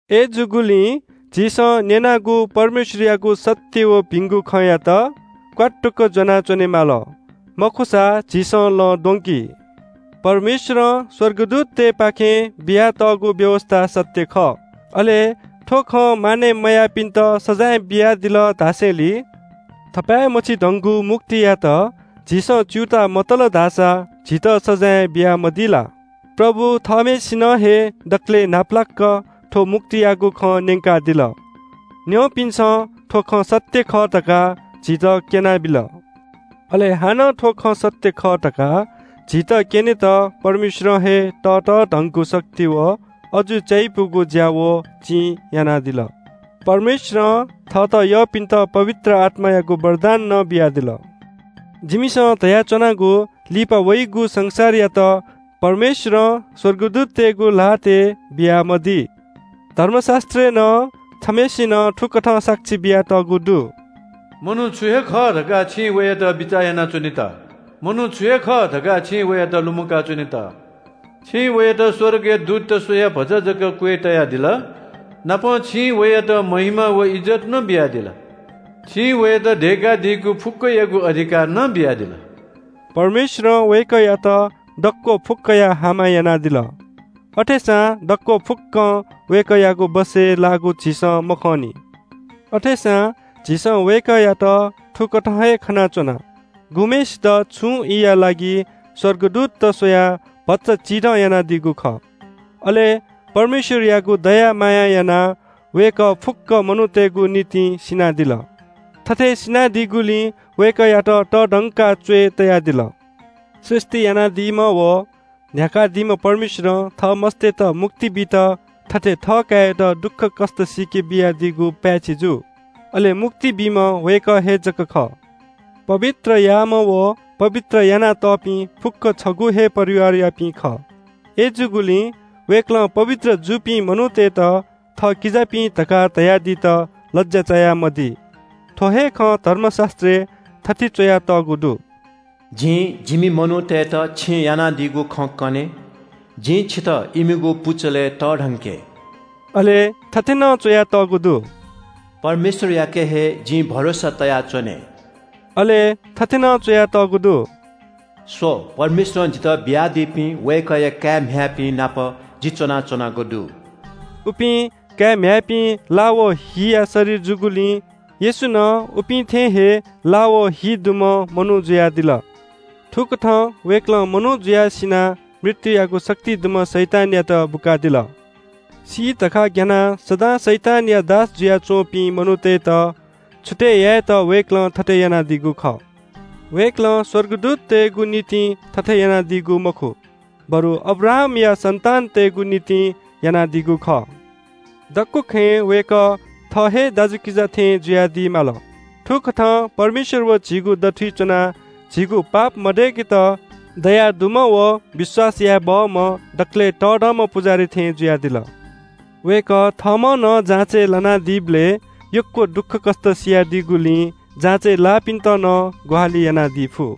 अय्‌जूगुलिं झीसं न्‍यनागु परमेश्‍वरयागु सत्‍य व भिंगु खँयात क्‍वात्तुक ज्‍वनाः च्‍वनेमाली, मखुसा झीसं लँ द्वंकी। परमेश्‍वरं स्‍वर्गदूततय्‌पाखें बियातःगु व्‍यवस्‍था सत्‍य खः। अले थ्‍व खँ मानय् मयाःपिन्‍त सजाँय बियादिल धासेंलि थपाय् मछिधंगु मुक्तियात झीसं च्‍यूताः मतल धाःसा झीत सजाँय बियामदी ला? प्रभु थःम्‍हय्‌सिनं हे दकलय् न्‍हापालाक थ्‍व मुक्तियागु खँ न्‍यंकादिल। न्‍यंपिन्‍सं थ्‍व खँ सत्‍य खः धकाः झीत क्‍यनाबिल। अले हानं थ्‍व खँ सत्‍य खः धकाः झीत क्‍यनेत परमेश्‍वरं हे ततःधंगु शक्ति व अजू चायापुगु ज्‍या व चिं यानादिल। परमेश्‍वरं थःत यःपिन्‍त पवित्र आत्‍मायागु वरदान नं बियादिल। जिमिसं धयाच्‍वनागु लिपा वइगु संसारयात परमेश्‍वरं स्‍वर्गदूततय्‌गु ल्‍हातय् बियामदी। धर्मशास्‍त्रय् नं छम्‍हय्‌सिनं थुकथं साक्षी बियातःगु दु – “मनू छु हे खः धकाः छिं वयात बिचाः यानाच्‍वनेत? मनूया काय् छु हे खः धकाः छिं वयात लुमंकाच्‍वनेत? छिं वयात स्‍वर्गया दूतत स्‍वयाः भचा जक क्‍वय् तयादिल। नापं छिं वयात महिमा व इज्‍जत नं बियादिल। छिं वयात दय्‌कादीगु फुक्‍कयागु अधिकार नं बियादिल।” परमेश्‍वरं वय्‌कःयात दक्‍व फुक्‍कया हामा यानादिल। अथेसां दक्‍व फुक्‍कं वय्‌कःयागु बसय् लाःगु झीसं मखंनि। अथेसां झीसं वय्‌कःयात थुकथं हे खनाच्‍वना, गुम्‍हय्‌सित छुं ईया लागि स्‍वर्गदूतत स्‍वयाः भचा चिधं यानादीगु खः। अले परमेश्‍वरयागु दया मायां यानाः वय्‌कः फुक्‍क मनूतय्‌गु निंतिं सिनादिल। थथे सिनादीगुलिं वय्‌कःयात तःधंकाः च्‍वय् तयादिल। सृष्‍टि यानादीम्‍ह व न्‍ह्याकादीम्‍ह परमेश्‍वरं थः मस्‍ततय्‌त मुक्ति बीत थथे थःकाय्‌यात दुःखकष्‍ट सीके बियादीगु पाय्‌छि जू। अले मुक्ति बीम्‍ह वय्‌कः हे जक खः। पवित्र याःम्‍ह व पवित्र यानातःपिं फुक्‍कं छगू हे परिवारयापिं खः। अय्‌जूगुलिं वय्‌कलं पवित्र जूपिं मनूतय्‌त थः किजापिं धकाः धयादीत लज्‍या चायामदी। थ्‍व हे खँ धर्मशास्‍त्रय् थथे च्‍वयातःगु दु – “जिं जिमि मनूतय्‌त छिं यानादीगु खँ कने, जिं छितः इमिगु पुचलय् तःधंके।” अले थथे नं च्‍वयातःगु दु – “परमेश्‍वरयाके हे जिं भरोसा तयाच्‍वने।” अले थथे नं च्‍वयातःगु दु – “स्‍व, परमेश्‍वरं जितः बियादीपिं वय्‌कःया काय्‌म्‍ह्याय्‌पिं नाप जि च्‍वनाच्‍वनागु दु।” उपिं काय्‌म्‍ह्याय्‌पिं ला व हिया शरीर जूगुलिं येशू नं उपिं थें हे ला व हि दुम्‍ह मनू जुयादिल। थुकथं वय्‌कलं मनू जुयाः सिनाः मृत्‍युयागु शक्ति दुम्‍ह शैतानयात बुकादिल। सी धकाः ग्‍यानाः सदां शैतानया दास जुयाच्‍वंपिं मनूतय्‌त छुतय् यायेत वय्‌कलं थथे यानादीगु खः। वय्‌कलं स्‍वर्गदूततय्‌गु निंतिं थथे यानादीगु मखु, बरु अब्राहामया सन्‍तानतय्‌गु निंतिं यानादीगु खः। दक्‍व खँय् वय्‌कः थः हे दाजुकिजा थें जुयादी माल। थुकथं परमेश्‍वर व झीगु दथुइ च्‍वनाः झीगु पापया प्रायश्‍चित यायेत दयादुम्‍ह व विश्‍वास याये बहःम्‍ह दकलय् तःधंम्‍ह पुजाहारी थें जुयादिल। वय्‌कः थःम्‍हं नं जाँचय् लानादीबलय् यक्‍व दुःखकष्‍ट सियादीगुलिं जाँचय् लाःपिन्‍त नं ग्‍वाहालि यानादी फु।